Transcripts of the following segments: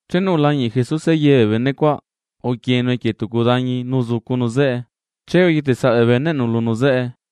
Chenu ulañiꞌ Jesuse ye bee bene cuaꞌ, uquienu equie tucu dañi nu uzucunu zeꞌe. Che uyetesaꞌ bee beneꞌnu lunu zeꞌe,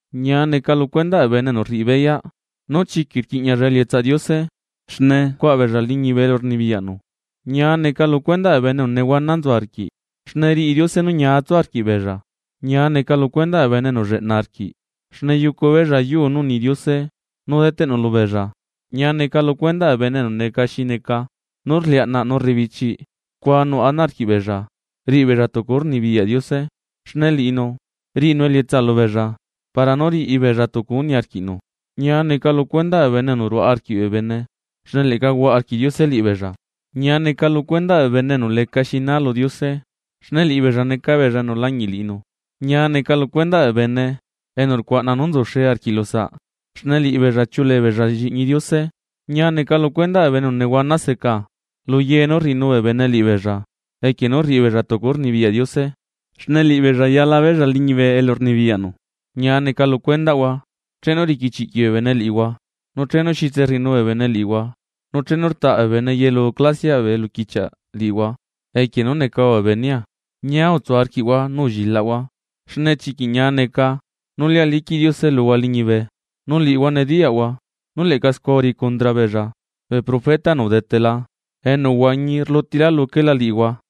―Ñia neca lu cuendaꞌ bee bene enu rriꞌi beyaꞌ nú chiquiꞌ rquiꞌñialla elietsaꞌ Diose, xne cuaꞌa beella liñibe elu rnibiyaꞌnu. ’Ñia neca lu cuendaꞌ bee bene enu nehuana nzu arquiꞌ, xne riꞌi Diose nú ñia tsu arquiꞌbeella. ’Ñia neca lu cuendaꞌ bee bene enu lleꞌna arquiꞌ, xne yucu beella yuu nú uni Diose nú deteꞌnu lubeella. ’Ñia neca lu cuendaꞌ bee bene enu neca xi neca nú rliaꞌnaꞌ nu rebichiꞌ, scua nuꞌ ana arquiꞌbeella riꞌibeella tucu nú rnibiyaꞌ Diose, xne liꞌinu riꞌinu elietsa lubeella para nú riꞌibeella tucu nú niarquiꞌnu. ’Ñia neca lu cuendaꞌ bee bene enu ruaꞌa arquiꞌ bee bene, xne leꞌca huaꞌa arquiꞌ Diose liꞌibeella. ’Ñia neca lu cuendaꞌ bee bene enu lecaxi naa lu Diose, xne liꞌibeella neca beella enu lañiꞌ liꞌinu. ’Ñia neca lu cuendaꞌ bee bene enu rcuaꞌna nú nzuxe arquiꞌ lusaꞌ, xne liꞌibeella chiuꞌuleebeella lliꞌñi Diose. ’Ñia neca lu cuendaꞌ bee bene enu nehuana seca luye nú rriꞌinu bee bene liꞌibeella equie nú rriꞌi beella tucu nú rnibiyaꞌ Diose, xne liꞌibeella chuꞌu beella liñibe elu rnibiyaꞌnu. ’Ñia neca lu cuendaꞌhua chenu riquichiꞌquiꞌ bee bene liꞌihua, nu chenu xitserriꞌinu bee bene liꞌihua nu chenu rtaꞌ bee bene yelu clasiaꞌ bee eluquichiaꞌ liꞌihua, equie nú necahua bee benea. Ñia utsu arquiꞌhua nu ullilaꞌhua, xne chiquiꞌ ñia neca nú lia liquiꞌ Diose luhua liñibe, nu liꞌihua nediyaꞌhua nú leꞌca scua uriꞌi condra beella bee profeta enu udetela enu uhuañi rlutila luquela liꞌihua.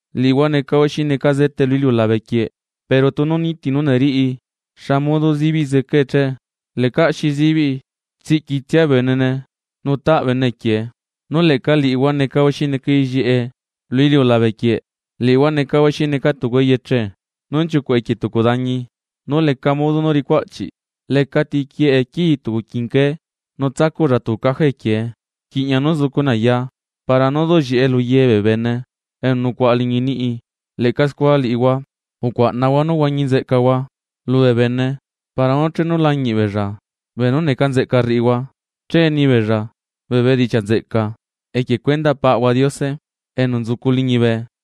’Liꞌihua necahua xi neca zete lu iliulabequieꞌ. Pero tunu niti nú neriꞌi, ¿xa modo zibiꞌ zecae che? Lecaꞌ xi zibiꞌi, tsiꞌquitsia benene nu taꞌ bene equiee. ’Nu leꞌca liꞌihua necahua xi neca ellieꞌe lu iliulabequieꞌ, liꞌihua necahua xi neca tucu eyeche nú nchiucuꞌ equie tucu dañi nú leca modo nú ricu aꞌchiꞌ. Lecati quieꞌe quii tucu quinqué nu tsacuꞌlla tucu caja equiee, rquiꞌña nú zucune aya para nú duꞌllieꞌe luye bee bene enu nucuaꞌa liñi niꞌi. Leꞌca scua liꞌihua, ucuaꞌnahua nú huañi nzeꞌcahua lubee bene para nú chenu lañiꞌ beella beenú neca nzeꞌca rriꞌihua, che nibeella bee bedichiaꞌ nzeꞌca equie cuendaꞌ Paꞌahua Diose enu nzucu liñibe.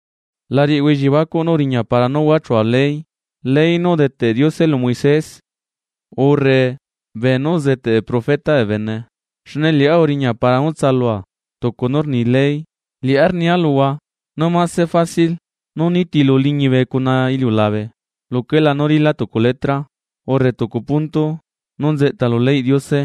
’La riꞌihua elliebacuꞌ nú uriña para nú huachua ley, ley nú udeteꞌ Diose lu Moisés urre beenú uzeteꞌ bee profeta bee bene, xne liꞌá uriña para nú tsalua tucu nú rni ley. Liꞌá rnia luhua nú mase fácil nú nitilu liñibe cuna iliulabe, luquelá nú rila tucu letra urre tucu punto nú nzeꞌta lu leyꞌ Diose,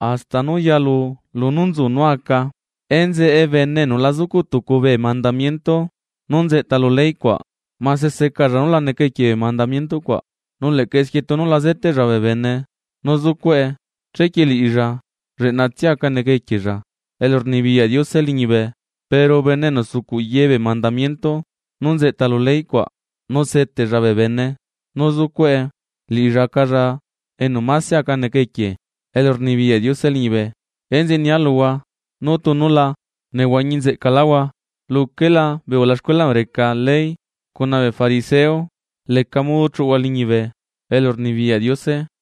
hasta nu yalu lunú nzu nú aca. Enzeꞌe bene enu la zucuꞌ tucu bee mandamiento nú nzeꞌta lu ley cuaꞌ, mase secalla nú la neca equie bee mandamiento cuaꞌ, nu leꞌca esquie tunu la zeteꞌlla bee bene nú zucuꞌe, chequie liꞌilla lleꞌnatsia aca neca equiella elurnibiyaꞌ Diose liñibe. Pero bene enu sucuꞌ ye bee mandamiento nú nzeꞌta lu ley cuaꞌ, nu seteꞌlla bee bene nú zucuꞌe, liꞌilla acalla enu máse aca neca equie elurnibiyaꞌ Diose liñibe. Enzeꞌe nia luhua nú tunu la nehuañi nzeꞌcaláhua luquelá bee ulaxcuela enu reca ley cuna bee fariseo leca modo chuꞌuhua liñibe elurnibiyaꞌ Diose.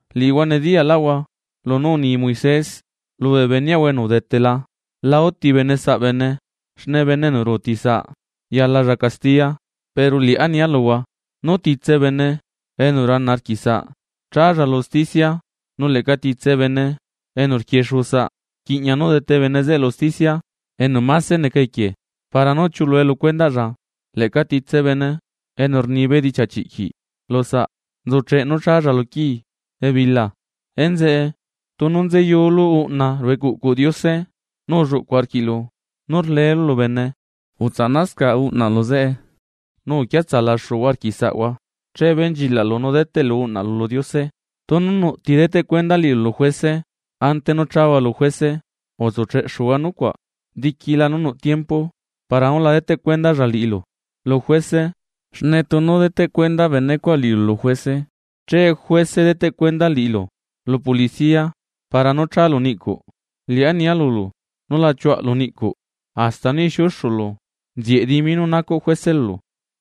’Liꞌihua nediyaꞌlaꞌhua lunú uni Moisés lubee beneꞌahua enu udetela: “La uti bene saꞌ bene, xne bene enu ruuti saꞌ yalalla castiya.” Pero liꞌá nia luhua nú titse bene enu rana arquiꞌsaꞌ, challa lu usticia, nu leꞌca titse bene enu rquiexuusaꞌ, rquiꞌña nú dete bene zeꞌe lu usticia enu mase neca equie para nú chiulue lu cuendaꞌlla, leꞌca titse bene enu rni bedichiaꞌ chiꞌquiꞌ lusaꞌ nzucheꞌ nú challa lu quii ebila. ’Enzeꞌe, tunu nzeyulu uꞌna ruꞌu ecuꞌcuꞌ Diose nu ulluꞌcu arquiꞌlu nú rlelu lu bene, utsaꞌnascaꞌ uꞌnaꞌlu zeꞌe. Nu uquiatsalaxuhua arquiꞌ saꞌhua, che benchilaꞌlu nu deteꞌlu uꞌna lu Diose. ’Tunu nuꞌ ti deteꞌ cuenda liꞌilu lu juese, ante nú chahua lu juese utsucheꞌxuhua nucuaꞌ diquila nú nuꞌ tiempo para nú la deteꞌ cuendalla liꞌilu lu juese, xne tunu deteꞌ cuenda benecuaꞌ liꞌilu lu juese che juese deteꞌcuenda liꞌilu lu policía para nú chalu niꞌcuꞌ. Liꞌá nia lulu nú la chiuaꞌlu niꞌcuꞌ hasta nú ixiuxulu nzieꞌ dimi nú nacuꞌ juese lulu.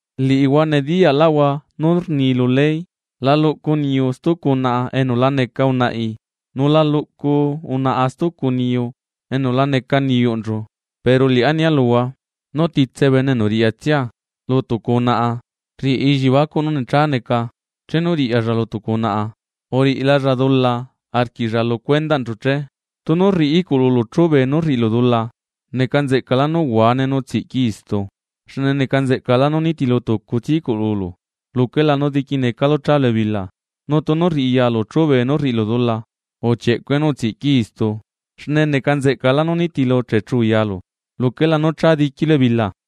’Liꞌihua nediyaꞌlaꞌhua nú rni lu ley: “La luꞌcu niyu stucu unaꞌa enu la neca unaꞌi, nu la luꞌcu unaꞌa stucu niyu enu la neca niyuꞌnchu.” Pero liꞌá nia luhua nú titse bene enu riꞌyatsia lu tucu unaꞌa nu rriꞌilla elliebacuꞌ nú necha neca chenu riꞌyalla lu tucu unaꞌa, uriꞌilalla dula arquiꞌlla lu cuendaꞌnchu che. ’Tunu rriꞌi iꞌcululu chube nú rriꞌilu dula, neca nzeꞌcalá nú uhuane nu utsiꞌquii istu. Xne neca nzeꞌcalá nú nitilu tucutsia iꞌcululu luquela nú diquinecalu chálu ebila. Nu tunu rriꞌi yalu chube nú rriꞌilu dula, uchieꞌcue nu utsiꞌquii istu. Xne neca nzeꞌcalá nú nitilu techu yalu luquela nú cha diquilu ebila.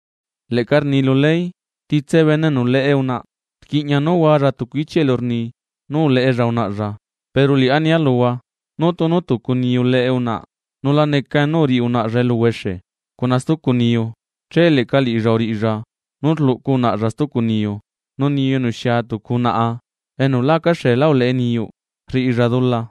’Leꞌca rni lu ley: “Titse bene enu leꞌe unaꞌa, rquiꞌña nú hualla tucu ichiꞌ elu rni nú uleꞌella unaꞌalla.” Pero liꞌá nia luhua nú tunu tucu niyu leꞌe unaꞌa, nula necane nú uriꞌi unaꞌalla eluhuexe cuna stucu niyu, che leꞌca liꞌilla uriꞌilla nú rluꞌcu unaꞌalla stucu niyu. Nu niyu enu xia tucu unaꞌa enu lá acaxeelá uleꞌe niyuꞌ, rriꞌilla dula.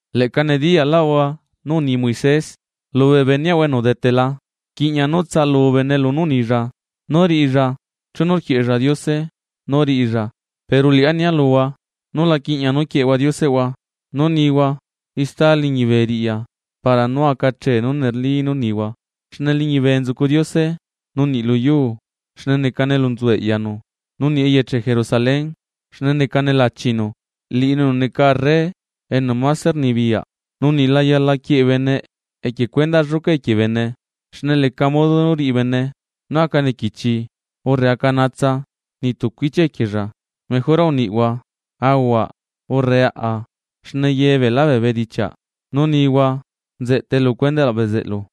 ’Leꞌca nediyalaꞌhua nú uni Moisés lubee beneꞌhua enu udetela: “Rquiꞌña nú tsaꞌalu bene lunú unilla nú riꞌilla chenu rquieꞌella Diose nú riꞌilla.” Pero liꞌá nia luhua nula quiꞌña nú quieꞌehua dioseꞌhua nú nihua ista liñibe riꞌya, para nú aca achee nú neli nú rnihua xne liñibe nzucu Diose, nu niꞌ lu yuu, xne necane elu nzu eꞌyanu, nu niꞌ eyeche Jerusalén, xne necane lachinu, liꞌinu enu neca arre enu mase rnibiyaꞌ. Nu niꞌ la yala quieꞌe bene equie cuendaꞌ lluca equie bene, xne leca modo nú riꞌi bene nú aca nequichi urre aca naatsa niꞌ tucu ichia equiella. Mejora uniꞌhua, “aahua” urre “aꞌa”, xne ye beela bee bedichiaꞌ nú nihua nzeꞌtae lu cuendaꞌ bezeꞌlu.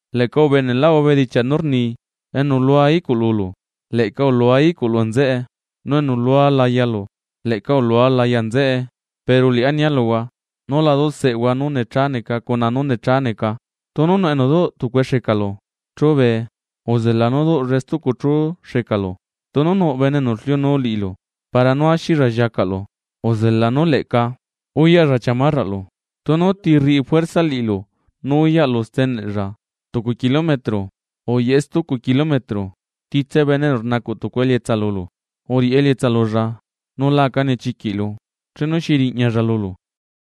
’Leꞌca ubeneꞌlaꞌhua bedichiaꞌ nú rni: “Enu lua iꞌcululu, leꞌca ulua iꞌculu nzeꞌe. Nu enu lua layalu, leꞌca ulua laya nzeꞌe.” Pero liꞌá nia luhua: Nú la duseꞌehua nú necha neca cuna nú necha neca, tunu nuꞌ enu duꞌ tucue xecalu chube, uzela nú duꞌllae stucu chú xecalu. Tunu nuꞌ bene enu rliunuu liꞌilu para nú axilla lliacaꞌlu, uzela nú leꞌca uyaꞌlla chiamarraꞌlu. Tunu ti rriꞌi juersa liꞌilu nú uyaꞌlu steneꞌlla tucu kilometro, uyaꞌe stucu kilometro. Titse bene enu rnacuꞌ tucu elietsa lulu, uriꞌi elietsa lulla, nula aca nechiquiꞌlu chenu xi riꞌñalla lulu.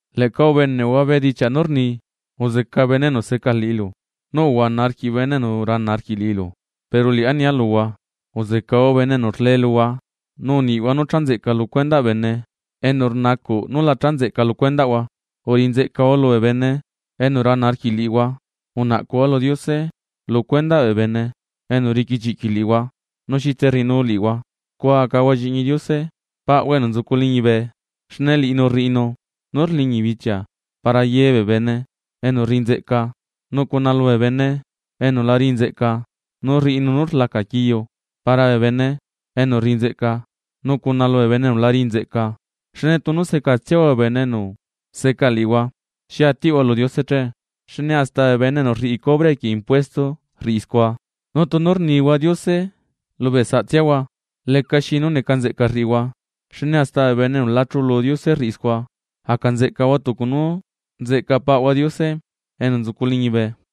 ’Leꞌca ubeneꞌhua bedichiaꞌ nú rni: “Uzeca bene enu seca liꞌilu nu uhuana arquiꞌ bene enu rana arquiꞌ liꞌilu.” Pero liꞌá nia luhua: Uzecahua bene enu rle luhua, nu niꞌhua nú cha nzeꞌca lu cuendaꞌ bene enu rnacuꞌ nú la cha nzeꞌca lu cuendaꞌhua, uriꞌi nzeꞌcahua lubee bene enu rana arquiꞌ liꞌihua, unaꞌcuhua lu Diose lu cuendaꞌ bee bene enu riquichiꞌquiꞌ liꞌihua nu xitse rriꞌinu liꞌihua. Scua acahua lliꞌñi Diose paꞌhua enu nzucu liñibe, xne liꞌinu rriꞌinu nú rliñi bichia para yebee bene enu rriꞌi nzeꞌca nu cuna lubee bene enu la riꞌi nzeꞌca, nu rriꞌinu nú rlaca quiu para bee bene enu rriꞌi nzeꞌca nu cuna lubee bene enu la riꞌi nzeꞌca. Xne tunu secatsiahua bee bene enu seca liꞌihua, ¿xi atiꞌhua lu Diose che? Xne hasta bee bene enu rriꞌi cobre equie impuesto rriꞌi scua. Nu tunu rnihua Diose lubee saꞌtsiahua, lecaxi nú neca nzeꞌca rriꞌihua, xne hasta bene enu la chulu Diose rriꞌi scua. Aca nzeꞌcahua tucu nú nzeꞌca paꞌhua Diose enu nzucu liñibe.